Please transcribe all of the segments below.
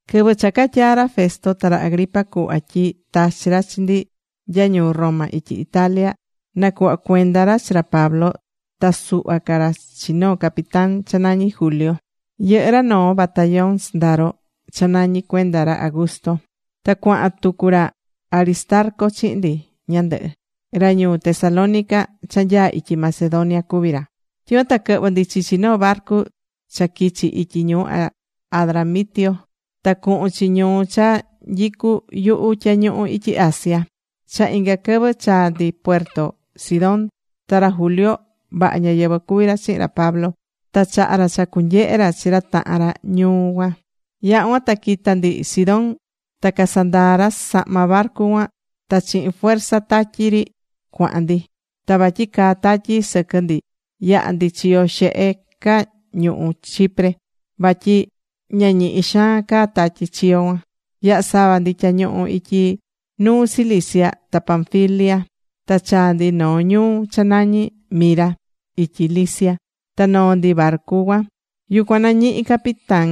Quɨvɨ cha catyaa̱ ra Festo ta ra Agripa cuhva tyi tachi̱ ra chi ndi nya ñuu Roma ityi Italia, nacuhva cuenda ra chi ra Pablo ta suhva ca ra chi noo capitán cha nañí Julio. Yɨhɨ́ ra noo batallón sɨndaro, cha nañi Cuenda Ra Augusto. Ta cuahan tucu ra Aristarco chihin ndi ñandɨhɨ. Ra ñuu Tesalónica cha nyaá ityi Macedonia cuví ra. Tyicuan ta quɨhvɨ̱ ndi chichi noo barcu cha quichi ityi ñuu Adramitio ta cuhun chi ñuu cha nyicú yuhu tyañuhu ityi Asia. Cha inga quɨvɨ chaa̱ ndi puerto Sidón. Ta ra Julio vaha ñáyɨvɨ cuví ra chihin ra Pablo. Ta chaha̱ ra cha cunyehe ra chi ra tahan ra ñuu cuan. Yaha̱ cuan ta quita̱ ndi Sidón ta casandaa̱ ra sahma barcu cuan ta chihin fuerza tatyi ri cuahan ndi. Ta vatyi caa tatyi sɨquɨ ndi yaha̱ ndi chiyo xehe ca ñuhú Chipre. Vatyi ña ñihi xaan caa tatyi chiyo cuan. Yaha̱ sava ndi tyañuhu ityi nuu Cilicia ta Panfilia, ta chaa̱ ndi noo ñuu cha nañi Mira ityi Licia. Ta noo̱ ndi barcu cuan. Yucuan nañihi̱ capitán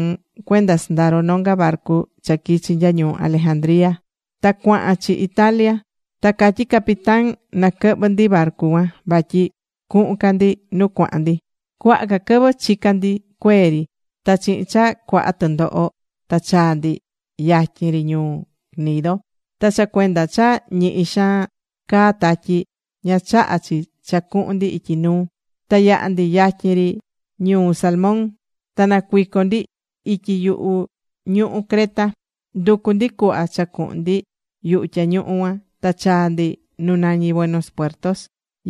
cuenda sɨndaro nonga barcu cha quichi nya ñuu Alejandría ta cuahan chi Italia. Ta catyi̱ capitán na quɨhvɨ ndi barcu cuan vatyi cuhun ca ndi nu cuahan ndi. Cuaha quɨvɨ chica̱ ndi cuee ri. Ta chihin cha cuaha tɨndoho ta chaa̱ ndi yatyin ri ñuu Gnido. Ta cha cuenda cha ñihi xaan caá tatyi, ña chaha̱ chi cha cuhun ndi ityi nuu, ta yaha̱ ndi yatyin ri ñuu Salmón. Ta nacuico̱ ndi ityi yuhu ñuhú Creta. Nducu̱ ndi cuhva cha cuhun ndi yuhu tyañuhu cuan ta chaa̱ ndi nu nañí Buenos Puertos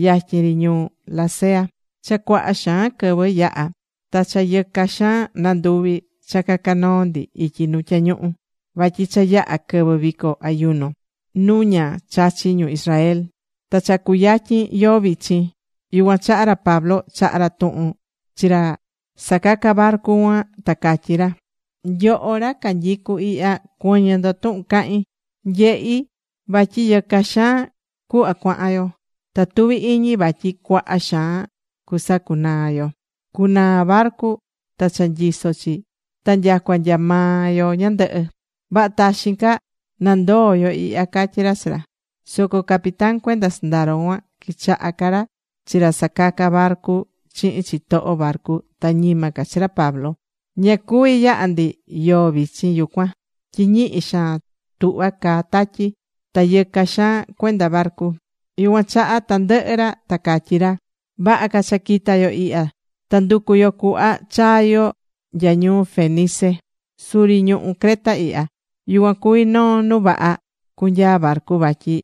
yatyin ri ñuu Lasea. Cha cuaha xaan quɨvɨ yaha̱ ta cha yɨca xaan nanduvi̱ cha caca noo ndi ityi nu tyañuhu. Vatyi cha yaha̱ quɨvɨ vico ayuno nu ña chachi ñu Israel. Ta cha cuyatyin yoo vichin. Yucuan chaha ra Pablo chaha̱ ra tuhun chi ra sacaca barcu cuan, ta catyí ra: ―Nyoho ra canyicú ihya, cuɨ̱ñɨ ndo tuhun cahín. Nyehí vatyi yɨca xaan cuhva cuahan yo. Ta tuví iñi vatyi cuaha xaan cusacunaa yo. Cunaa barcu ta cha nyisó chi ta nyacua nya maa yo ñandɨhɨ. Vaha taxin ca nandoo yo ihya ―catyí ra chi ra. Soco capitán cuenda sɨndaro cuan quichaha̱ ca ra chi ra sacacá barcu chihin chitoho barcu ta ñima ca chi ra Pablo. Ña cuví yaha ndi yoo vichin yucuan tyi ñihi xaan tuhvá caa tatyi, ta yɨca xaan cuenda barcu. Yucuan chaha tandɨhɨ ra ta catyí ra: ―Vaha ca cha quita yo ihya ta nducu yo cuhva chaa yo nya ñuu Fenice suri ñuhú Creta ihya. Yucuan cuví noo nu vaha cunyaa barcu vatyi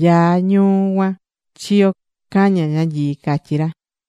nyaa ñuu cuan chiyo caña ñanyii ―catyí ra.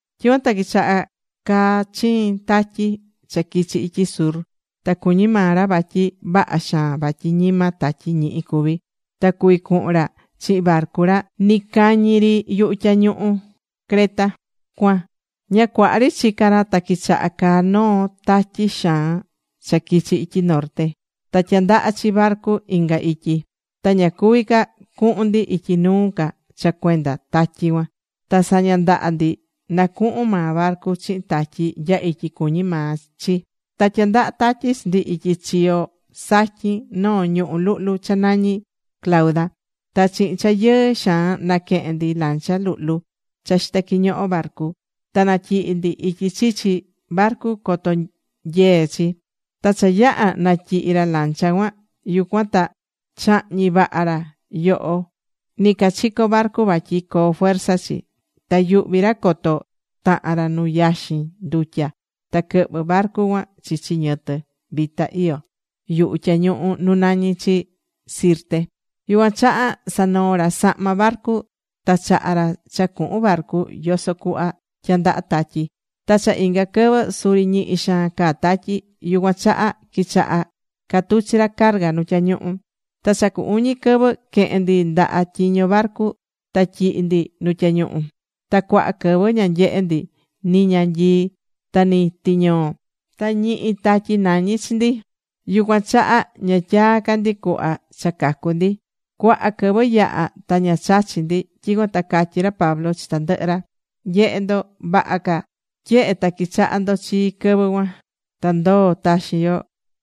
Tyicuan ta quichahá caa chiin tatyi cha quichi ityi sur. Ta cuñí maa ra vatyi vaha xaan vatyi ñima tatyi ñihi cuví, ta cuvi cuhun ra chihin barcu ra nɨcañi ri yuhu tyañuhu ñuhú Creta cuan. Ña cuaha ri chicá ra ta quichaha̱ caa noo tatyi xaan cha quichi̱ ityi norte. Ta tyandahá chi barcu inga ityi. Ta ña cuví ca cuhun ndi ityi nuu ca cha cuenda tatyi cuan. Ta saña ndaha ndi nacuhun maa barcu chihin tatyi nya ityi cuñí maa chi. Ta tyandahá tatyi chi ndi ityi chiyo satyin noo ñuhú luhlu cha nañí Clauda. Ta chihin cha yɨɨ xaan naquehe̱n ndi lancha luhlu cha xitá quiñoho barcu, ta natyihi̱ ndi ityi chichi barcu coto nyee chi. Ta cha yaha̱ natyihi̱ ra lancha cuan, yucuan ta chahñi̱ vaha ra yoho nɨcachico barcu vatyi coo fuerza chi. Ta yuhví ra coto tahan ra nu yaxin ndutya ta quɨhvɨ barcu cuan chichi ñɨtɨ vita iyó yuhu tyañuhu nu nañí chi Sirte, yucuan chaha sanoo̱ ra sahma barcu ta chaha̱ ra cha cuhun barcu yoso cuhva tyandahá tatyi. Ta cha inga quɨvɨ suri ñihi xaan caá tatyi. Yucuan chaha quichaha̱ catuchi ra carga nu tyañuhu. Ta cha cu uñi quɨvɨ quehe̱n ndi ndaha tyiño barcu ta tyihi̱ ndi nu tyañuhu. Ta cuaha quɨvɨ ña nyehe̱ ndi ni ñanyii ta ni tiñoo. Ta ñihi tatyi nañí chi ndi. Yucuan chaha ña tyaa̱ ca ndi cuhva cha cacu ndi. Cuaha quɨvɨ yaha̱ ta ña chachí ndi. Tyicuan ta catyí ra Pablo chi tandɨhɨ ra: ―Nye̱he ndo, vaha ca tyehe ta quichaha̱ ndo chii quɨvɨ cuan, ta ndoo taxin yo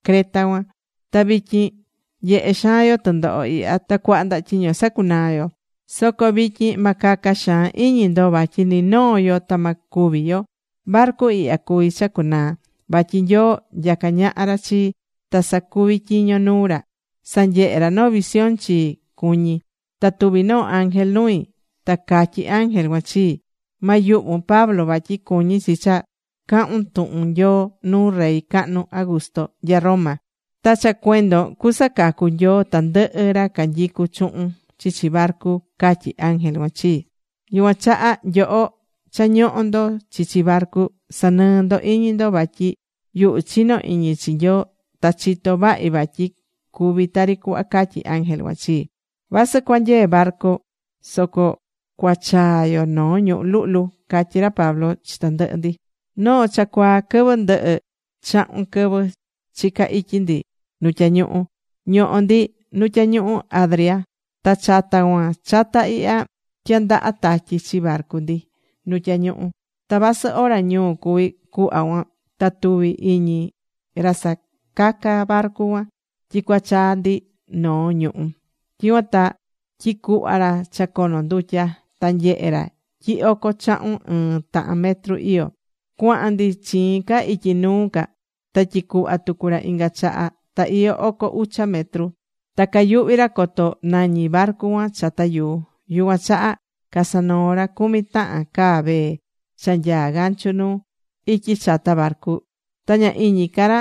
Creta cuan. Ta vityin nyehé xaan yo tɨndoho ihya ta cuaha ndaha tyiño sacunaá yo. Soco vityin ma caca xaan iñi ndo vatyi ni noo yo ta ma cúvi yo. Barcu ihya cuví cha cunaa. Vatyi Nyoo nyacá ñaha ra chii, ta sacuví tyiño nuu ra, sanyehe̱ ra noo visión chii cuñi. Ta tuvi̱ noo ángel nui. Ta catyí ángel cuan chii: “Ma yuhvun, Pablo. Vatyi cuñí chi cha cahun tuhun Nyoo nuu rey cahnu Augusto nya Roma. Ta cha cuendon cusacacu Nyoo tandɨhɨ ra canyicu chuhun chichi barcu”, catyí ángel cuan chii. Yucuan chaha nyoho cha ñohó ndo chichi barcu, sa̱nɨɨ ndo iñi ndo. Vatyi yuhu chinó iñi chi Nyoo. Ta chitó vahi vatyi cuvi tari cuhva catyí ángel cuan chii. Vasɨ cuanyee barcu soco cuachaa yo noo ñuhú luhlu ―catyí ra Pablo chi tandɨhɨ ndi. Noo cha cuaa quɨvɨ ndɨhɨ chahun quɨvɨ chica̱ ityi ndi nu tyañuhu, ñohó ndi nu tyañuhu Adria. Ta chata cuan chata ihya tyandahá tatyi chi barcu ndi nu tyañuhu. Ta vasɨ ora ñuu cuví cuhva cuan ta tuvi̱ iñi ra sacacá barcu cuan tyi cuachaa ndi noo ñuhú. Tyicuan ta tyicuhva̱ ra cha cono ndutya. Ta nyehe̱ ra tyi oco chahun ɨɨ́n tahan metro iyó. Cuaha̱n ndi chiin ca ityi nuu ca. Ta tyicuhva̱ tucu ra inga chaha. Ta iyó oco ucha metro. Ta cayuhví ra coto nañi barcu cuan chata yuu. Yucuan chaha casanoo̱ ra cumi tahan caa vee cha nyaa gancho nuu, ityi chata barcu. Ta ña iñi ca ra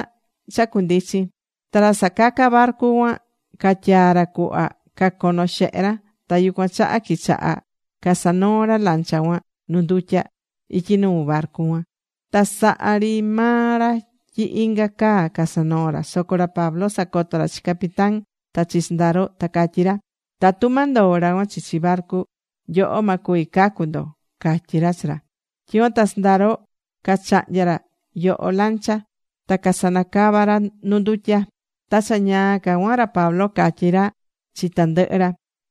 cha cundichin. Ta ra sacacá barcu cuan catyaa̱ ra cuhva cacono xehe ra. Ta yucuan chaha quichaha casanoó ra lancha cuan nu ndutya ityi nuu barcu cuan. Ta sahá ri maa ra tyi inga caa casanoó ra. Soco ra Pablo sacoto̱ ra chi capitán ta chi sɨndaro ta catyí ra: ―Tatu ma ndoo ra cuan chichi barcu. Nyoho ma cuvi cacu ndo ―catyí ra chi ra. Tyicuan ta sɨndaro cachahnya̱ ra yoho lancha. Ta casanacava̱ ra nu ndutya. Ta cha ñaa ca cuan ra Pablo catyí ra chi tandɨhɨ ra: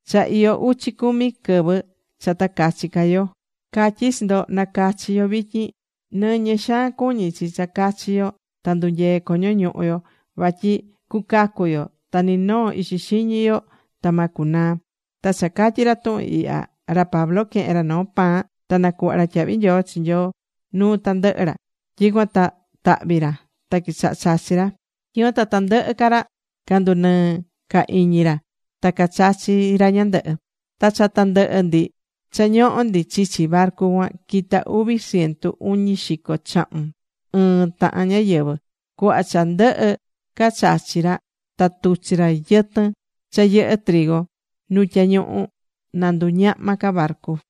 ―Cha iyó uchi cumi quɨvɨ cha ta cachi ca yo. Catyí chi ndo, na cachi yo vityin. Nɨñɨ xaan cuñí chi cha cachi yo ta ndunyee coño ñuhu yo. Vatyi cucacu yo ta ni noo ixi xiñi yo ta ma cunaa. Ta cha catyi̱ ra tuhun ihya, ra Pablo quehe̱n ra noo pan ta nacuhva̱ ra tyahvi nyoo chi Nyoo nuu tandɨhɨ ra. Tyicuan ta tahvi̱ ra ta quichaha̱ chachi ra. Tyicuan ta tandɨhɨ ca ra candunɨɨ̱ ca iñi ra ta cachachi̱ ra ñandɨhɨ. Ta cha tandɨhɨ ndi cha ñohó ndi chichi barcu cuan, quita uvi ciento uñi xico chahun ɨɨ́n tahan ñáyɨvɨ. Cuhva cha ndɨhɨ ca chachi̱ ra ta tuchi̱ ra yɨtɨn cha yɨhɨ́ nu tyañuhu na nduñahma ca barcu.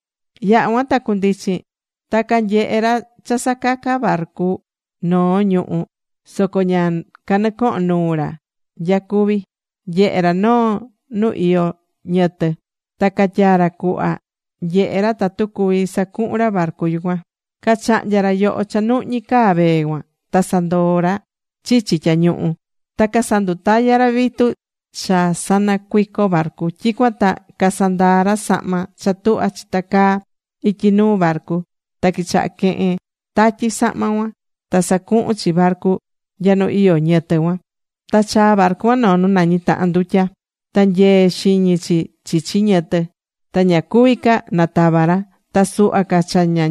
Yaha̱ cuan ta cundichin. Ta canyehe̱ ra cha sacacá barcu noo ñuhú, soco ña canɨcoho̱n nuu ra nya cuví cuan. Nyehe̱ ra noo nu iyó ñɨtɨ. Ta catyaa ra cuhva nyehe ra tatu cuví sacuhun ra barcu yucuan. Cachahnya̱ ra yoho cha nuhñí caa vee cuan. Ta sandoo̱ ra chichi tyañuhu. Ta casandutaya̱ ra vitu cha sanacuico barcu. Tyicuan ta casandaa̱ ra sahma cha tuhvá chitacaá ityi nuu barcu. Ta quichaha̱ quehen tatyi sahma cuan, ta sacuhún chi barcu nya nu iyó ñɨtɨ cuan. Ta chaa̱ barcu cuan noo nu nañi tahan ndutya. Ta nyee xiñi chi chichi ñɨtɨ. Ta ña cuví ca natava ra. Ta suhva ca cha ña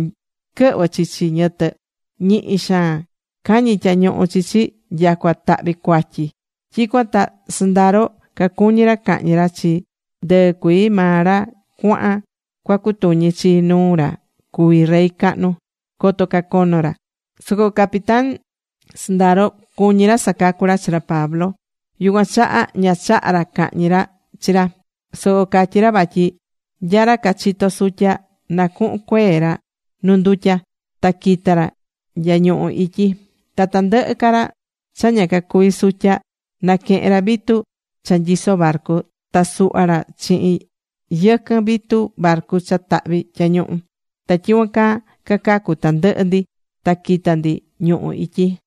quɨhvɨ chichi ñɨtɨ, ñihi xaan cañí tyañuhu chi chi, nyacua tahvi̱ cuatyi chi. Tyicuan ta sɨndaro cacuñí ra cahñi ra chi ndɨɨ cuii maa ra cuaha̱n cuacutuñi chi nuu ra cuví rey cahnu, coto cacono ra. Soco capitán sɨndaro cuñí ra sacacu ra chi ra Pablo. Yucuan chaha ña chaha̱ ra cahñi ra chi ra, soco catyi̱ ra vatyi nya ra cachitó sutya, na cuhun cuee ra nu ndutya ta quita ra nya ñuhú ityi. Ta tandɨhɨ ca ra cha ña cacuví sutya, na quehen ra vitu cha nyisó barcu, ta suhva ra chihin yɨquɨn vitu barcu cha tahvi̱ tyañuhu. Ta tyicuan caa cacacu̱ tandɨhɨ ndi ta quita̱ ndi ñuhú ityi.